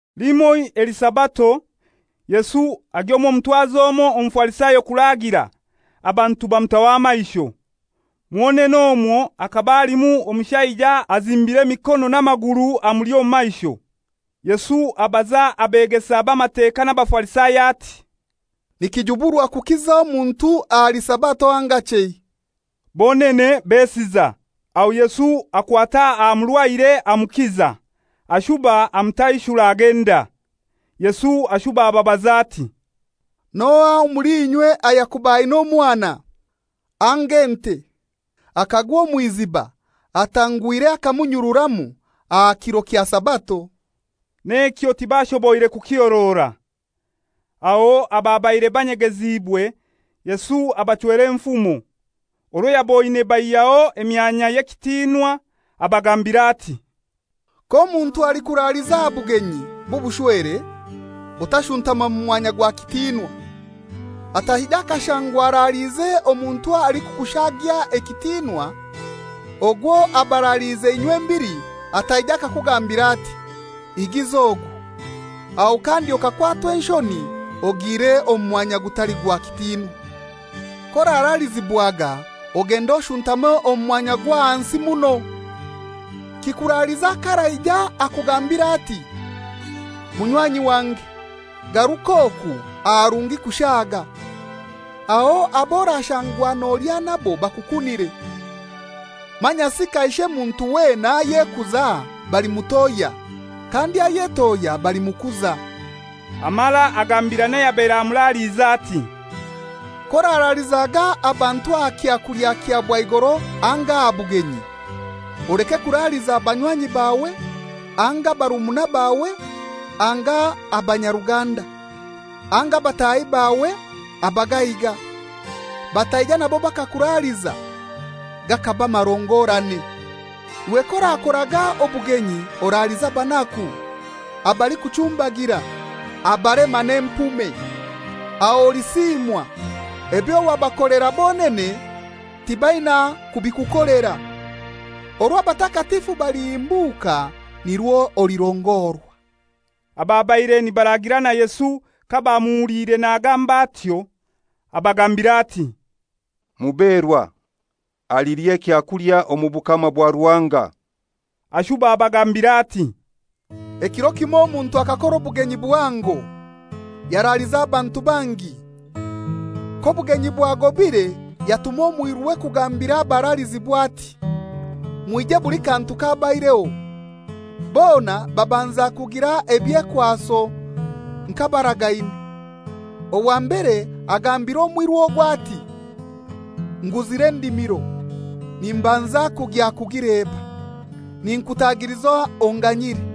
Limoi eli Sabato, Yesu agya omw'omutwazi omoi Omufarisayo kuraagira, abantu bamutaho amaisho. Mwonene omwo hakaba halimu omushaija azimbiire emikono n'amaguru amuli omu maisho. Yesu abaza abeegesa b'Amateka n'Abafarisayo ati, «Nikijuburwa kukiza omuntu ahali Sabato anga chei?» Bonene besiza. Aho Yesu akwata aha murwaire amukiza, ashuba amutaishura agenda. Yesu ashuba ababaza ati, «N'ohai omuli inywe ayakuba aina omwana, anga ente, akagwa omw'iziba atanguhire akamunyururamu aha kiro kya Sabato?» N'ekyo tibashoboire kukihorora. Aho ababaire banyegeziibwe, Yesu abachwera enfumo, orwo yaboine baihyaho emyanya y'ekitinwa, abagambira ati, «K'omuntu alikuraliza aha bugenyi bw'obushwere, otanshutama mu mwanya gwa kitinwa, ataija akashangwa araliize n'omuntu alikukushaagya ekitinwa. Ogwo abaraliize inywembili ataija akakugambira ati, ‹Higiza ogu,› aho kandi okakwatwa enshoni ogiire omu mwanya ogutali gwa kitinwa. K'oraralizibwaga ogende oshuntame omu mwanya ogw'ahansi muno, kikuraliza k'araija akugambiire ati, ‹Munywanyi wange, garuka oku aharungi kushaaga.› Aho ab'orashangwa nolya nabo bakukunire. Manyasi kaishe muntu weena ayekuza balimutohya, kandi ayetohya balimukuza.» Amara agambira n'ayabaire amuraliize ati, «K'oraralizaga abantu aha kyakulya kya bwaigoro anga aha bugenyi, oleke kuraliza banywanyi bawe anga barumuna bawe anga abanyaruganda, anga bataahi bawe abagaiga, bataija nabo bakakuraliza, gakaba marongorane. Iwe k'orakoraga obugenyi, oralize abanaku, abalikuchumbagira, abalema n'empume. Aho olisiimwa, ebyo wabakolera bonene tibaina kubikukolera. Orwo abatakatifu balihimbuka nirwo olirongorwa.» Ababaire nibaraagira na Yesu kabamuhuliire nagamba atyo, abagambira ati, «Muberwa alilya ekyakulya omu bukama bwa Ruhanga!» Ashuba abagambira ati, «Ekiro kimoi omuntu akakora obugenyi buhango, yaraaliza abantu bangi. K'obugenyi bwagobire yatuma omwiruwe kugambira abaralizibwa ati, ‹Mwije, buli kantu kabaireho.› Bona babanza kugira ebyekwaso nk'abaragaine. Owa mbere agambira omwiru ogwo ati, ‹Nguzire endimiro, nimbanza kugya kugileba. Ninkutagiliza onganyire.›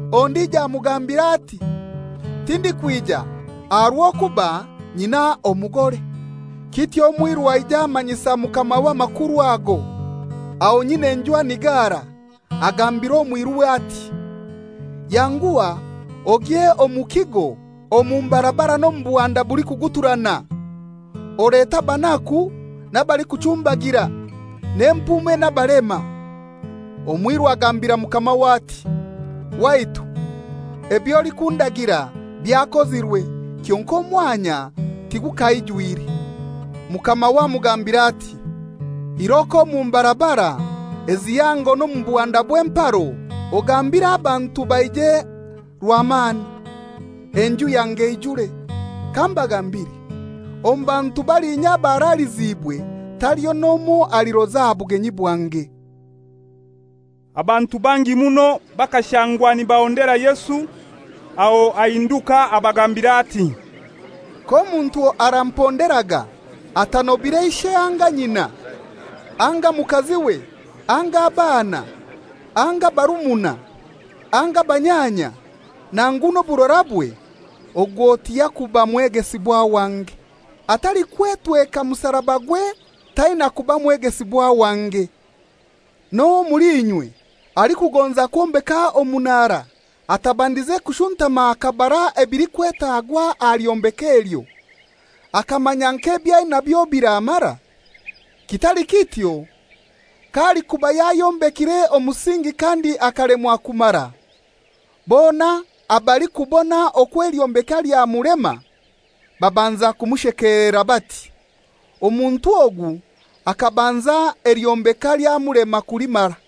Ondijo amugambira ati, ‹Tindikwija aha rw'okuba nyina omugore.› Kityo omwiru aija amanyisa mukamawe amakuru ago. Aho nyin'enju anigara, agambira omwiruwe ati, ‹Yanguha ogye omu kigo omu mbarabara n'omu buhanda bulikuguturana, olete abanaku n'abalikuchumbagira, n'empume n'abalema.› Omwiru agambira mukamawe ati, ‹Waitu, eby'olikundagira byakozirwe, kyonkai omwanya tigukaijwire.› Mukamawe amugambira ati, ‹Iroko omu mbarabara ezihango n'omu buhanda obw'emparo ogambire abantu baije rwamani, enju yange eijure. Kambagambire, omu bantu balinya abaraliziibwe taliho n'omoi aliroza aha bugenyi bwange.›» Abantu bangi muno bakashangwa nibahondera Yesu. Aho ahinduka abagambira ati, «K'omuntu aramponderaga atanobire ishe anga nyina anga mukaziwe anga abaana anga barumuna anga banyanya, nangu n'oburorabwe, ogwo tiyakuba mwegesibwa wange. Atalikwetweka musarabagwe taina kuba mwegesibwa wange. N'ohai omuli inywe alikugonza kwombeka omunara, atabandize kushuntama akabara ebilikwetagwa aha lyombeka elyo, akamanya nk'ebyainabyo biramara? Kitali kityo, k'alikuba yayombekire omusingi kandi akalemwa kumara, bona abalikubona okwo elyombeka lyamulema babanza kumushekelera bati, ‹Omuntu ogu akabanza elyombeka lyamulema kulimara.›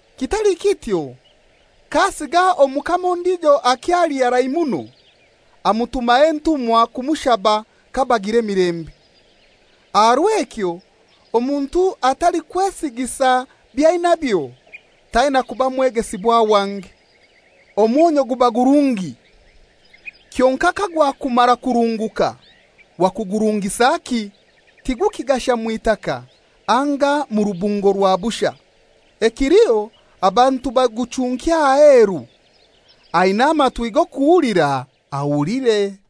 Kitali kityo, k'asiga omukama ondijo akyali harai muno, amutumaho entumwa kumushaba kabagira emilembe. Aha rw'ekyo omuntu atalikwesigisa by'ainabyo taina kuba mwegesibwa wange. «Omwonyu guba gurungi. Kyonkai kagwakumara kurunguka, wakugurungisaki? Tigukigasha mw'itaka anga mu rubungo rwa busha. Ekiliho abantu baguchunkya aheru. Aina amatwi g'okuhulira ahulire.»